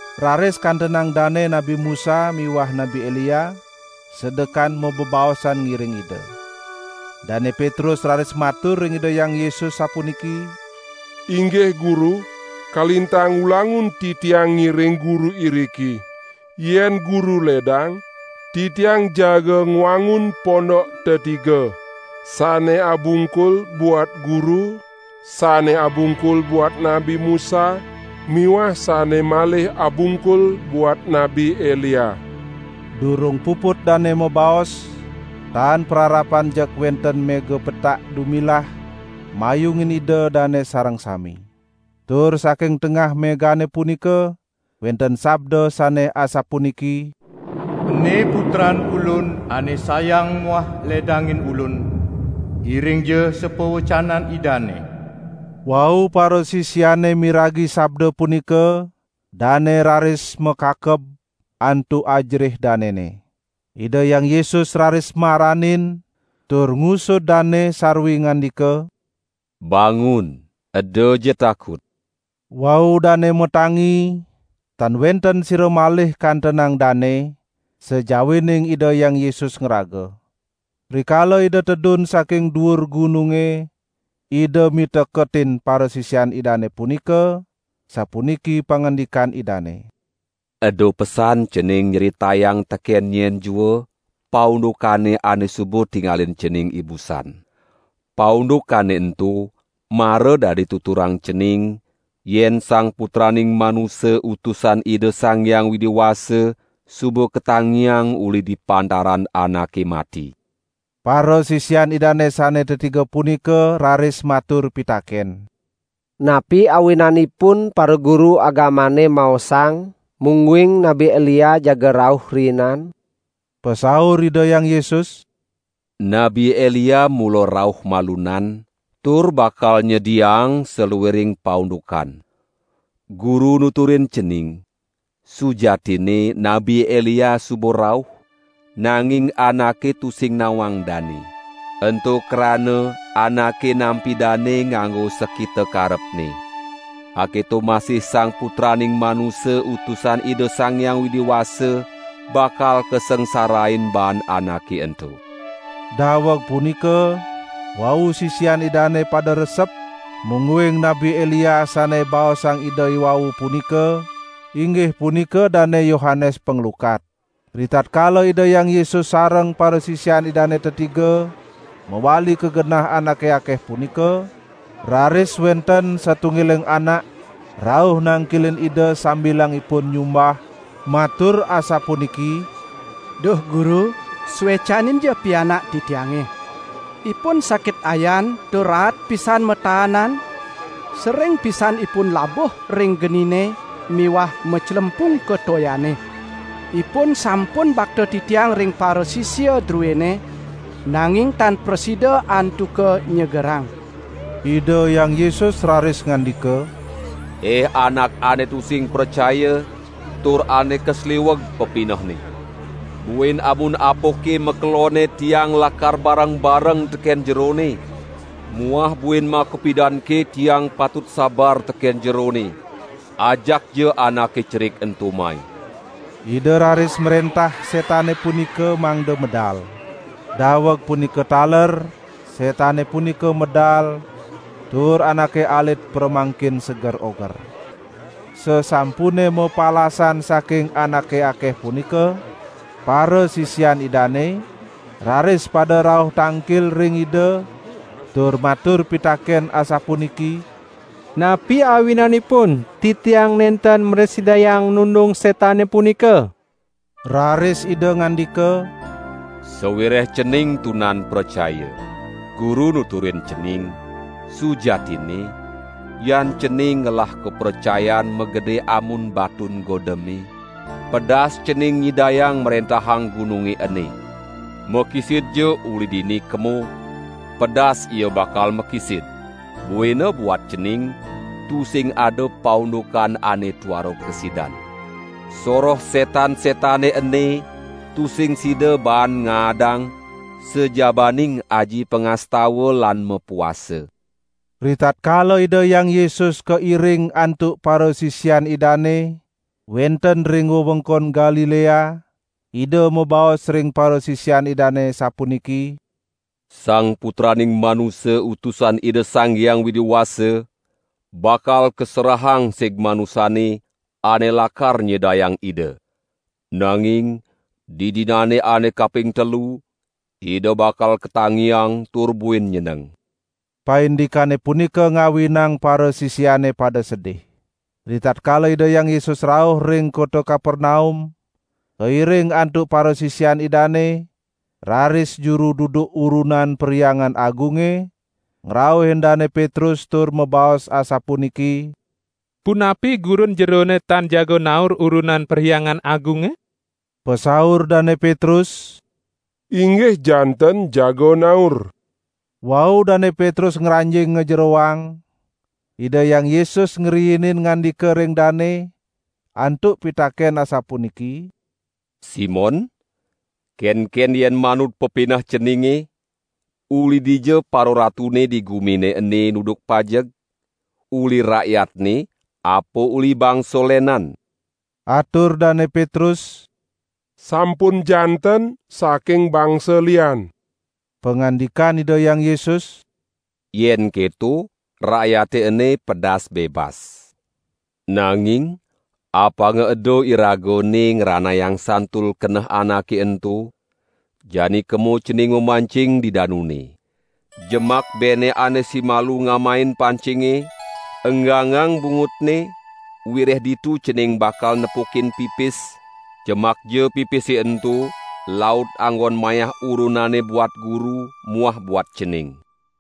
Raris kantenang Dane Nabi Musa miwah Nabi Elia sedekan mabebaosan ngiring Ida. Dane Petrus raris matur ring Ida Hyang Yesus sapuniki: "Inggih Guru, kalintang ulangun titiang ngiring Guru iriki. Yen Guru ledang, titiang jaga ngwangun pondok tetiga. Sane abungkul buat Guru, sane abungkul buat Nabi Musa miwah sane malih abungkul buat Nabi Elia." Durung puput dane mabaos, tan pararapan jeg wenten mega petak dumilah mayungin ida dane sareng sami. Tur saking tengah megane punika wenten sabda sane asapuniki: "Ene Putran Ulun ane sayang muah ledangin Ulun, iringja sapawecanan Idane!" Wau parasisiane miragi sabda punika, dane raris makakeb, antuk ajerih danene. Ida Hyang Yesus raris maranin tur ngusud dane sarwi ngandika: "Bangun, edaja takut!" Wau dane matangi, tan wenten sira malih kantenang dane, sajawining Ida Hyang Yesus ngraga. Rikala Ida tedun saking duur gununge, Ida miteketin parasisian Idane punika, sapuniki pangandikan Idane: "Eda pesan cening nyritayang teken nyen jua paundukane ane suba tingalin cening ibusan. Paundukane ento mara dadi tuturang cening yen Sang Putraning Manusa Utusan Ida Sang Hyang Widi Wasa suba katangiang uli di pantaran anake mati." Parasisian Idane sane tetiga punika raris matur pitaken: "Napi awinanipun paraguru agamane maosang mungguing Nabi Elia jaga rauh riinan?" Pasaur Ida Hyang Yesus: "Nabi Elia mula rauh malunan tur bakal nyediaang saluiring paundukan. Guru nuturin cening, sujatinne Nabi Elia suba rauh, nanging anake tusing nawang dane. Ento krana anake nampi dane nganggo sakita karepne. Aketo masih Sang Putraning Manusa Utusan Ida Sang Hyang Widi Wasa bakal kasangsarain baan anake ento." Daweg punika, wau sisian Idane pada resep mungguing Nabi Elia sane baosang Ida iwau punika, inggih punika Dane Yohanes Panglukat. Ritatkala Ida Hyang Yesus sareng parasisian Idane tetiga mawali ka genah anake akeh punika, raris wenten satunggiling anak rauh nangkilin Ida sambilang ipun nyumbah, matur asapuniki: "Duh Guru suecaninja pianak titiange. Ipun sakit ayan tur raat pisan mataanan, sering pisan ipun labuh ring genine miwah maclempung ka toyane. Ipun sampun bakta titiang ring parasisia druene, nanging tan prasida antuka nyegerang." Ida Hyang Yesus raris ngandika: "Ih anak ane tusing pracaya, tur ane kasliweg pepinehne. Buin amun apake makelonne Tiang lakar bareng-bareng teken jerone? Muah buin makapidanke Tiang patut sabar teken jerone? Ajakja anake cerik ento mai!" Ida raris mrentah setane punika mangda medal. Daweg punika taler setane punika medal tur anake alit pramangkin seger oger. Sasampune mapalasan saking anake akeh punika, parasisian Idane raris pada rauh tangkil ring Ida tur matur pitaken asapuniki: "Napi awinanipun titiang nenten mrasidayang nundung setane punika?" Raris Ida ngandika: "Sawireh cening tunan pracaya. Guru nuturin cening: Sujatinne, yan cening ngelah kapracayan magede amun batun godeme, pedas cening nyidayang mrentahang gununge ene: 'Makisidja uli dini kemo!' Pedas ia bakal makisid; buina buat cening tusing ada paundukan ane tuara kasidan. [ Soroh setan-setane ene tusing sida baan ngaadang sajabaning aji pangastawa lan mapuasa.]" Ritatkala Ida Hyang Yesus kairing antuk parasisian Idane wenten ring wewengkon Galilea, Ida mabaos ring parasisian Idane sapuniki: "Sang Putraning Manusa Utusan Ida Sang Hyang Widi Wasa bakal kaserahang sig manusane, ane lakar nyedayang Ida. Nanging didinane ane kaping telu Ida bakal katangiang tur buin nyeneng." Paindikane punika ngawinang parasisiane pada sedih. Ritatkala Ida Hyang Yesus rauh ring kota Kapernaum kairing antuk parasisian Idane, raris juru duduk urunan Perhyangan Agunge ngrauhin Dane Petrus tur mabaos asapuniki: "Punapi Gurun jerone tan jaga naur urunan Perhyangan Agunge?" Pasaur Dane Petrus: "Inggih janten jaga naur!" Wau Dane Petrus ngranjing ngajeroang, Ida Hyang Yesus ngriinin ngandika ring dane antuk pitaken asapuniki: "Simon, kenken yen manut pepineh ceninge; uli dija pararatune di gumine ene nuduk pajeg? Uli rakyatne apa uli bangsa lenan?" Atur Dane Petrus: "Sampun janten saking bangsa lian!" Pangandikan Ida Hyang Yesus: "Yen keto rakyate ene pedas bebas. Nanging apanga eda Iraga ene ngranayang santul keneh anake ento, jani kemo cening mamancing di danune. Jemak bene ane simalu ngamain pancinge, enggangang bungutne, wireh ditu cening bakal nepukin pipis, jemakja pipise ento laut anggon mayah urunane buat Guru muah buat cening."